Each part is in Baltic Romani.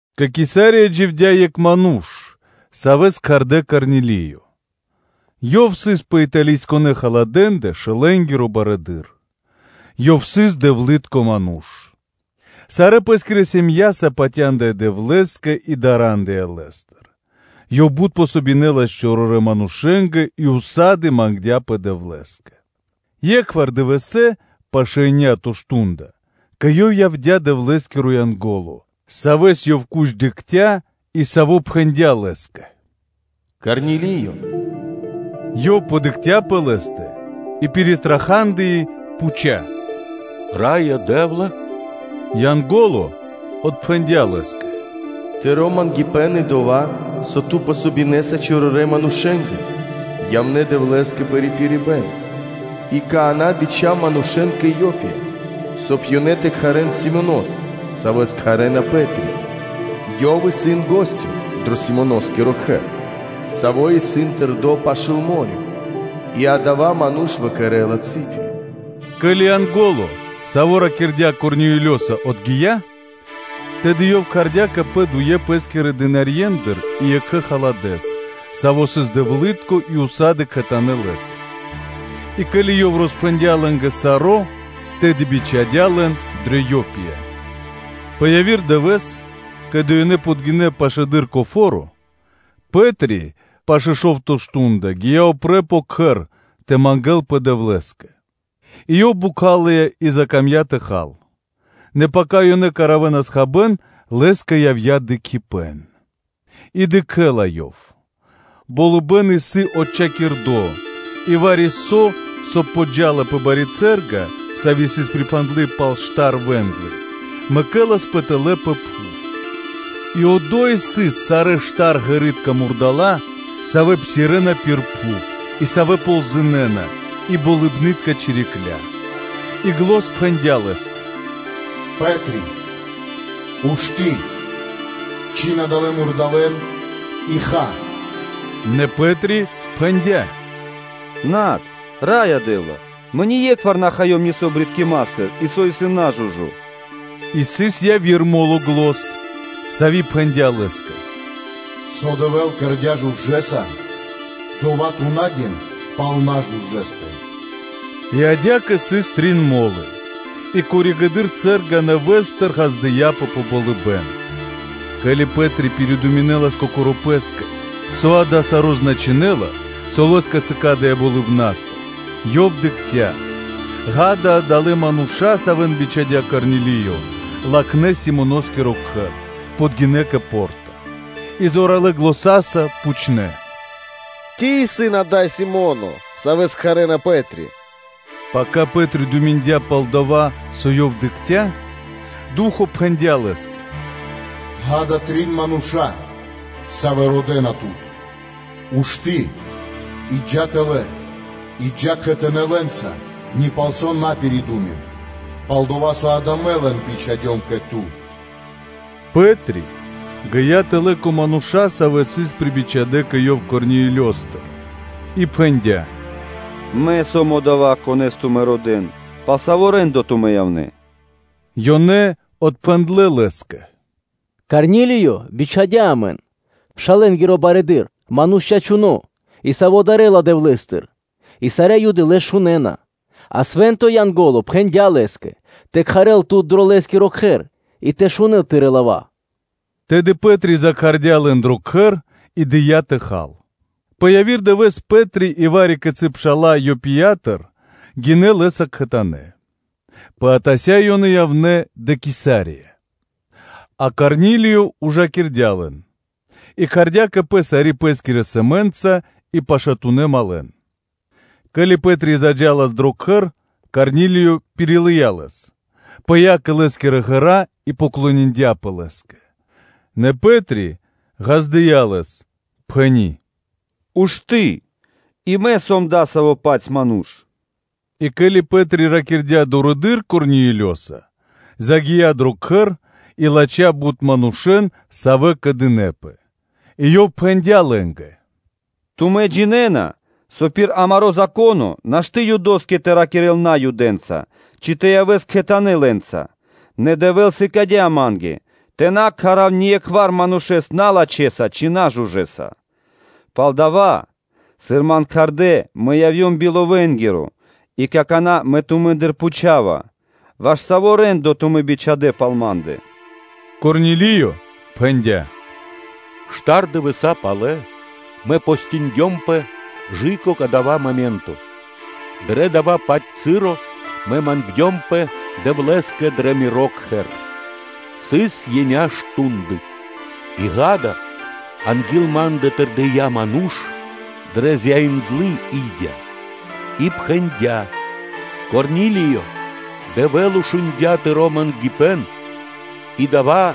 Кэ Кесария дживдя́ екх ману́ш, савэ́с кхардэ́ Корнилиё, ёв сыс пэ Италийсконэ (Италиякиро) полко шэлэнгиро барыдыро́, ёв сыс дэвлы́тко ману́ш, сарэ́ пэ́скирэ сэм΄яса (ирьяса) патяндыя Дэвлэ́скэ и дарандыя Лэ́стыр, ёв бут помогинэлас чорорэнгэ манушэ́нгэ и ўса́ды (сак) мангдя́пэ Дэвлэ́скэ, е́кхвар дывэсэ́, пашэ́ еня́то мардо́ (шту́нда), кэ ёв явдя́ Дэвлэ́скиро Янго́ло, савэ́с ёв куч дыкхця́, и саво́ и пхэндя́ лэ́скэ: “Корни́лие.” Ёв дыкхця сы́гэс пэ лэ́стэ и пиристрахадыи, пхуця́: “Раё Дэ́вла?” Янго́ло отпхэндя́ лэ́скэ: “Тыро́ мангипэ́н и дова́, со ту дэ́са васт чорорэ́ манушэ́нгэ, явнэ́ Дэвлэ́скэ пэ рипирибэ́н. И какана́ бичха́в манушэ́н кэ Иопия, соб (кай) ёнэ тэ кхарэ́н Симонос, савэ́с кхарэ́на Пэ́три. Ёв исын гостё дро Симоноскиро кхэр, саво́ исын тэрдо́ пашы́л мо́рё (дэрья́в), и адава́ ману́ш выкэрэла цыпи. Ке́ли Янго́ло, саво́ ракирдя́ Корнилиёса, отгия́, тэды ёв кхардя́ кэ пэ дуе пэ́скирэ дынарье́ндыр (слугэ́ндыр) и екхэ халадэс, саво́ сыс дэвлы́тко и ўса́ды (сак) кхэтанэ́ лэ́са; и, ке́ли ёв роспхэндя́ лэ́нгэ саро́, тэды бичхадя́ лэн дрэ Иопия. Пэ яви́р дывэ́с, ке́ли ёнэ подгинэ́ пашылэды́р кэ фо́ро, Пэ́три пашэ́ шо́вто мардо́ (шту́нда) гия́ упрэ́ пэ кхэр тэ мангэ́лпэ Дэвлэ́скэ. И ёв бокхалыя и закамдя́ тэ хал. Нэ пака ёнэ кэравэнас хабэ́н, лэ́скэ явдя́ дыкхибэ́н и ёв издрандыя. И дыкхэ́ла ёв: болыбэ́н исын отчхакирдо, и вари-со, со подджа́ла пэ бари цэ́рга, сави́ сыс припхандлы пал штар вэ́нглы, мэкэласпэ тэлэ́ пэ пхув; и одо́й сыс сарэ́ штарґэритка мурдала́ (жывотна), савэ́ псирэ́на пир пхув, и савэ́ ползынэна, и болыбны́тка чирикля́. И зан пхэндя́ лэ́скэ: “Пэтрие! Ушты́, чхин адалэ́ мурдалэ́н и ха” Нэ Пэ́три пхэндя́: “Над, Раё Дэ́вла! Мэ ние́кхвар на хаём нисо́ джунгалыпнастыр (брыткиматыр) и со исын нажужо.” И сыс яви́р мо́ло зан, сави́ пхэндя́ лэ́скэ: “Со Дэвэ́л кэрдя́ жужэса (чыстонэса), дова́ ту на гин пал нажужэстэ.” И адя́кэ сыс трин мо́лы и коригэды́р (позжэ) цэ́рга нэвэ́стыр ґаздыя́пэ пэ болыбэ́н. Ке́ли Пэ́три пиридуминэлас кокоро́ пэ́скэ, со дава́ саро́ значынэ́ла, со лэ́скэ сыкадыя́ болыбна́стыр, ёв дыкхця́; ґа́да, адалэ́ мануша́, савэ́н бичхадя́ Корнилиё, латхнэ́ Симоноскиро кхэр, подгинэ́ кэ по́рта, и зоралэ́ заня́са пхучнэ́: “Ци исын ада́й Си́моно, Савэс кхарэ́на Пэ́три?” Пака Пэ́три думиндя пал дова́, со ёв дыкхця́, Ду́хо (Фа́но) пхэндя́ лэ́скэ: “Ѓа́да, трин мануша́, савэ́ родэ́на тут; ушты́ и джа́ тэлэ́ и джа́ кхэтанэ́ лэ́нца ни палсо́ на пиридумин; пал-дова́ со дава́ мэ лэн бичхадём кэ ту.” Пэ́три гия́ тэлэ́ кэ мануша́, савэ́ сыс прибичхадэ кэ ёв Корнилиёстыр и пхэндя́: “Мэ сом одова́, конэ́с тумэ́ родэ́на; пал саво́ рэ́ндо (де́ло) тумэ́ явнэ́?” Ёнэ отпхэндлэ́ лэ́скэ: “Корнилиё бичхадя́ амэн, шэлэнгиро барыдыро́, ману́ш чачуно́ и саво́ дарэ́ла Дэвлэ́стыр и сарэ́ Юды лэс шунэ́на, а свэ́нто Янго́ло пхэндя́ лэ́скэ тэ кхарэл тут дро лэ́скиро кхэр и тэ шунэ́л тырэ́ лава́.” Тэды Пэ́три кхардя́ лэн дро кхэр и дыя́ тэ хал. Пэ яви́р дывэ́с Пэ́три и вари-кицы́ пша́ла Иопиятыр гинэ́ лэ́са кхэтанэ́. Пэ атася́ ёнэ явнэ́ дрэ Кесария. А Корнилиё ужакирдя лэн, и кхардя́ кэ пэ сари́ пэ́скири сэмэ́нца и пашатунэ́ малэн (другэн). Ке́ли Пэ́три заджалас дро кхэр, Корнилиё пирилыя лэс, пыя́ кэ лэ́скирэ ґэра́ и кэрдя́ шэрэ́са (поклониндяпэ) лэ́скэ. Нэ Пэ́три ґаздыя́ лэс, пхэни́: “Ушты́! И мэ сом адасаво́-паць ману́ш.” И ке́ли Пэ́три ракирдя́ дурэды́р Корнилиёса, ёв загия́ дро кхэр и латхя́ бут манушэ́н, савэ́ кэдынэпэ. И ёв пхэндя́ лэ́нгэ: “Тумэ́ джинэ́на, со пир амаро́ Зако́но нашты́ Юдоскэ тэ ракирэ́л Наюдэнца, ци тэ явэ́л кхэтанэ́ лэ́нца; нэ Дэвэ́л сыкадя́ ма́нгэ, тэ на кхарав ние́кхвар манушэ́с налачхэса ци нажужэса. Палдава́, сыр ман кхардэ́, мэ явдём би ловэнгиро; и какана́ мэ тумэ́ндыр пхучава: “Ваш саво́ рэ́ндо тумэ́ бичхадэ́ пал ма́ндэ?” Корнилиё пхэндя́: “Штар дывэса́ палэ мэ постиндёмпэ кэ/жы́ко кадава́ моменто, дрэ дава́-паць часо мэ мангдёмпэ Дэвлэ́скэ дрэ миро кхэр, сыс еня́ (биекхэ́скиро дэш) мардэ́; и ґа́да, анги́л ма́ндэ тэрдия́ ману́ш дрэ зяиндлы и́дя, и пхэндя́: “Корни́лие! Дэвэ́л шундя́ тыро́ мангипэ́н и дова́,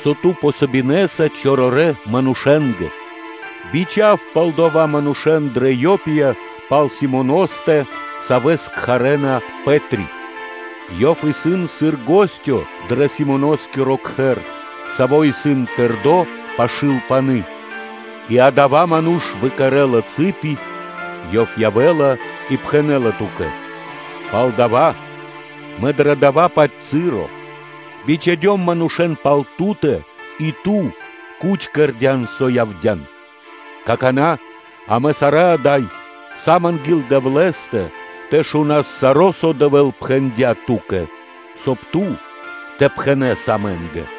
со ту дэ́са васт чорорэ́ манушэ́нгэ. Бичха́в палдова́ манушэ́н дрэ Иопия пал Симоностэ, савэ́с кхарэ́на “Пэ́три”; ёв исын сыр гостё дро Симоноскиро кхэр, саво́ исын тэрдо́ пашы́л пани́ и адава́ ману́ш выкэрэла цыпи; ёв явэ́ла и пхэнэ́ла ту́кэ. Палдава́ мэ дрэ дава́-паць часо бичхадём манушэ́н пал ту́тэ и ту куч кэрдя́н, со явдя́н. Какана́ амэ сарэ́ ада́й сам анги́л Дэвлэ́стэ тэ шунас саро́, со Дэвэ́л пхэндя́ ту́кэ, соб (кай) ту тэ пхэнэ́с амэ́нгэ.”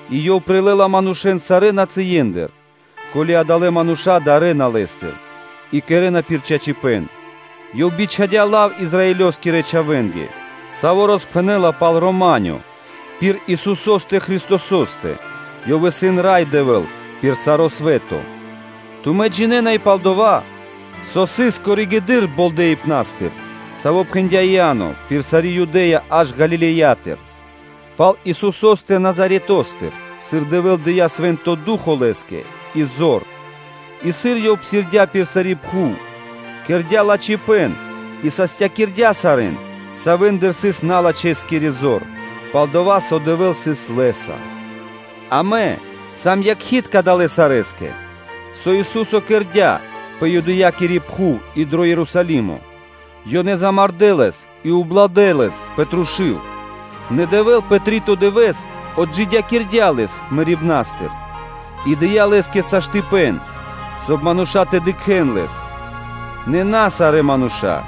и Ёв прилэ́ла манушэ́н сарэ́ нацые́ндыр, ко́ли адалэ́ мануша́ дарэ́на Лэ́стыр и кэрэ́на пир чачипэ́н. Ёв бичхадя́ лав Израилёскирэ чхавэ́нгэ, саво́ роспхэнэ́ла пал “рама́нё” пир Исусо́стэ Христосо́стэ, Ёв исын Рай Дэвэ́л пир саро́ свэ́то. Тумэ́ джинэ́на и пал дова́, со сыс пало́ (после) болдэипэн, саво́ пхэндя́ Иа́но пир сари́ Юдэ́я аж Галилеятыр, пал Исусо́стэ Назаретостыр: сыр Дэвэ́л дыя́ Свэ́нто Ду́хо (Фа́но) Лэ́скэ и зор, и, сыр Ёв псирдя́ пир сари́ пхув, кэрдя́ лачхипэ́н и састякирдя сарэ́н, савэ́ндэ сыс налачхэскири зор, пал-дова́ со Дэвэ́л сыс Лэ́са. Амэ сам якхи́тка далэ́ сарэскэ, со Ису́со кэрдя́ пэ Юдэякири пхув и дро Ерусалимо, ёнэ замардэ́ Лэс и убладэ Лэс пэ трушу́л. Нэ Дэвэ́л пэ три́то дывэ́с отджидякирдя́ Лэс мэрибна́стыр и дыя́ Лэ́скэ саштыпэн, соб (кай) мануша́ тэ дыкхэ́н Лэс. Нэ на сарэ́ мануша́,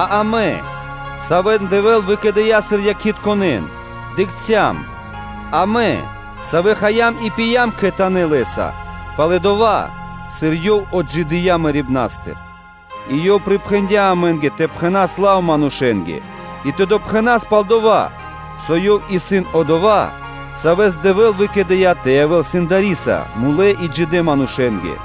а амэ, савэ́н Дэвэ́л выкэдыя́ сыр якхитконэн, дыкхцям, амэ, савэ́ хаям и пиям кхэтанэ́ Лэ́са пало́ дова́, сыр Ёв отджидыя́ мэрибна́стыр. И Ёв припхэндя́ амэ́нгэ тэ пхэнас лав манушэ́нгэ и тэ допхэнас пал дова́, со Ёв исын Одова́, Савэс Дэвэ́л выкэдыя́ тэ явэ́л Сэндариса пэ мулэ́ и джидэ́ манушэ́ндэ.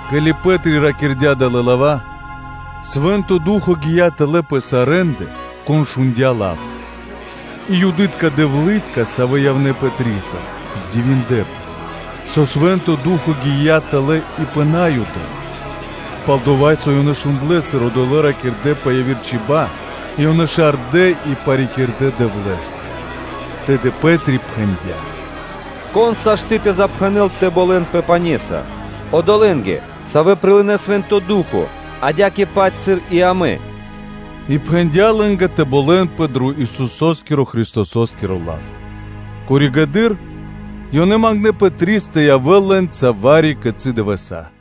Ке́ли Пэ́три ракирдя́ далэ́ лава́, Свэ́нто Ду́хо (Фа́но) гия́ тэлэ́ пэ сарэ́ндэ, кон шундя́ лав. И Юдытка дэвлы́тка, савэ́ явнэ́ Пэтриса, дивиндлэ́пэ, со Свэ́нто Ду́хо (Фа́но) гия́ тэлэ́ и пэ Наюдэ́ндэ; пал-дова́ со ёнэ шундлэ́, сыр одолэ́ ракирдэ́ пэ яви́р чиба́/чибья́, и ёнэ барьякирэнас паты́в Дэвлэ́скэ. Тэды Пэ́три пхэндя́: “Кон могинэ́ла (сашты́) тэ запхэнэл тэ болэнпэ пане́са, одолэ́нгэ, савэ́ прилынэ́ Свэ́нто Ду́хо (Фа́но), адя́кэ-паць, сыр и амэ?” И пхэндя́ лэ́нгэ тэ болэнпэ дро Исусо́скиро Христосо́скиро лав. Коригэды́р (позжэ) ёнэ мангнэ́ Пэтрис тэ явэ́л лэ́нца вари-кицы́ дывэса́.